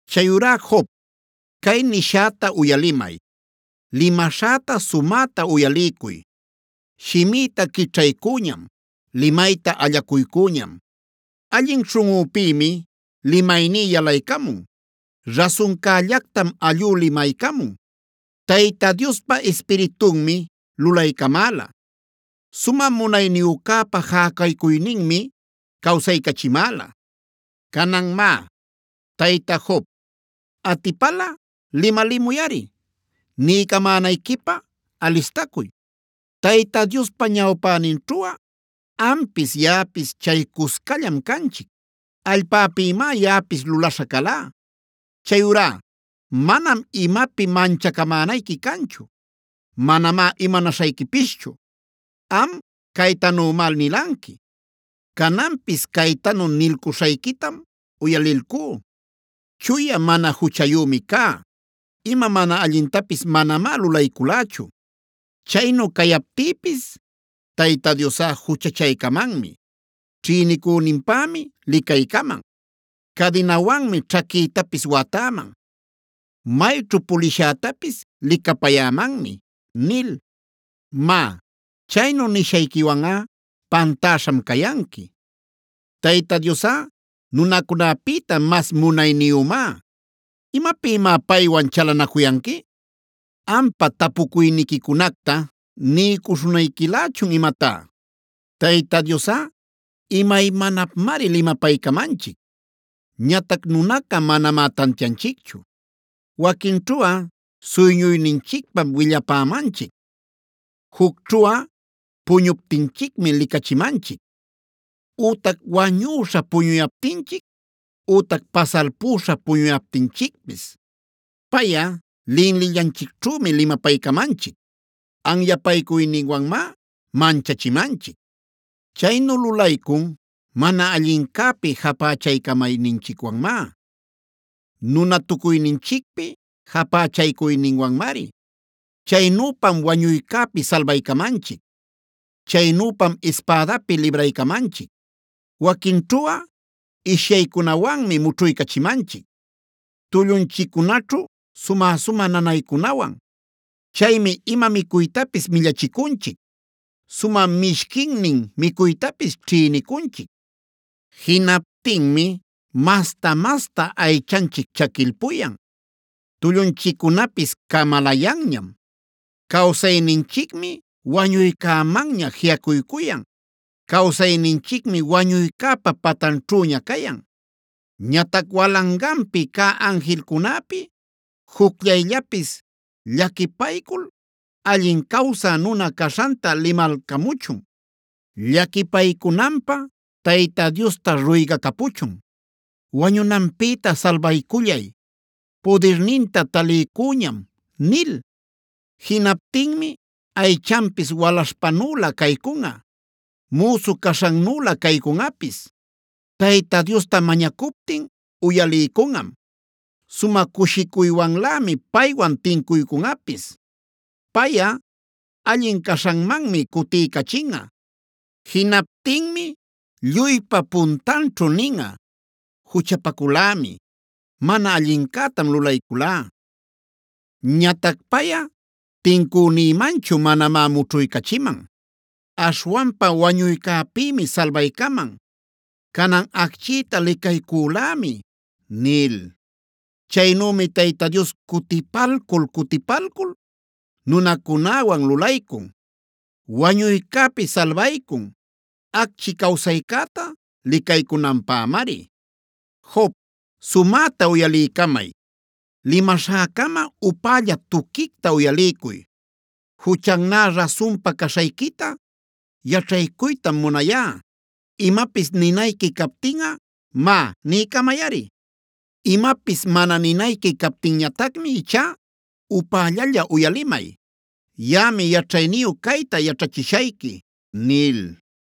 “Chayurá Job, cay nishäta uyalimay; limaśhäta sumäta uyaliycuy. Shimïta quićhaycüñam, limayta allacuycüñam. Allin śhunꞌüpïmi limayní yalaycamun; rasuncällactam allú limaycamun. Tayta Diospa Ispiritunmi lulaycamäla; Sumä Munayniyücäpa jäcaycuyninmi cawsaycachimäla. Canan má, Tayta Job, atipalꞌa limalimuyꞌari; niycamänayquipä alistacuy. Tayta Diospa ñawpäninćhuꞌa ampis yaꞌapis chay cuscallam canchic; allpäpïmá yaꞌapis lulaśha calá. Chayurá manam imapi manchacamänayqui canchu; manamá imanaśhayquipischu. “Am caytanümá nilanqui, cananpis caytanu nilcuśhayquitam uyalilcú: ‘Chuya, mana juchayümi cá; ima mana allintapis manamá lulayculächu. Chaynu cayaptïpis Tayta Diosꞌa juchachaycamanmi; ćhïnicüninpämi licaycaman. Cadinawanmi ćhaquïtapis watäman; mayćhu pulishätapis licapayämanmi’ nil. “Má, chaynu nishayquiwanꞌa pantäśham cayanqui; Tayta Diosꞌa nunacunäpïta mas munayniyümá. ¿Imapïmá paywan chalanacuyanqui? ¿Ampa tapucuyniquicunacta niycuśhunayquilächun imatá? Tayta Diosꞌa imaymanapmari limapaycamanchic. Ñatac nunaca manamá tantianchicchu. Waquinćhuꞌa suyñuyninchicpam willapämanchic; jucćhuꞌa puñuptinchicmi licachimanchic ütac wañüśha puñuyaptinchic, ütac pasalpüśha puñuyaptinchicpis. Payꞌa linlillanchicćhümi limapaycamanchic; anyapaycuyninwanmá manchachimanchic. Chaynu lulaycun mana allincäpi japächaycamayninchicwanmá; nunatucuyninchicpi japächaycuyninwanmari. Chaynüpam wañuycäpi salbaycamanchic; chaynüpam ispädapi libraycamanchic. “Waquinćhuꞌa ishyaycunawanmi mućhuycachimanchic, tullunchiccunaćhu sumä-sumä nanaycunawan. Chaymi ima micuytapis millachicunchic, sumä mishquinnin micuytapis ćhïnicunchic. Jinaptinmi masta-masta aychanchic chaquilpuyan; tullunchiccunapis camalayanñam. Cawsayninchicmi wañuycämanña jiꞌacuycuyan; cawsayninchicmi wañuycäpa patanćhüña cayan. “Ñatac walanganpi cä anjilcunäpi jucllayllapis llaquipaycul allin cawsä nuna caśhanta limalcamuchun, llaquipaycunanpä Tayta Diosta ruygacapuchun: ‘Wañunanpïta salbaycullay; pudirninta taliycüñam’ nil. Jinaptinmi aychanpis walaśhpanülä caycunꞌa; müsu caśhannülä caycunꞌapis. Tayta Diosta mañacuptin uyaliycunꞌam; sumä cushicuywanlämi paywan tincuycunꞌapis. Payꞌa allin caśhanmanmi cutiycachinꞌa. Jinaptinmi lluypa puntanćhu ninꞌa: ‘Juchapaculämi, mana allincätam lulayculá. Ñatac payꞌa tincünïmanchu manamá mućhuycachiman. Aśhwanpa wañuycäpïmi salbaycaman. Canan acchïta licaycülämi’ nil. “Chaynümi Tayta Dios cutipalcul-cutipalcul nunacunäwan lulaycun. Wañuycäpi salbaycun, acchi cawsaycäta licaycunanpämari. “Job, sumäta uyaliycamay; limaśhäcama upälla tuquicta uyaliycuy. Juchannä rasunpa caśhayquita yaćhaycuytam munayá. Imapis ninayqui captinꞌa, má niycamayꞌari. Imapis mana ninayqui captinñatacmi ichá upällalla uyalimay. Yaꞌami yaćhayniyu cayta yaćhachishayqui” nil.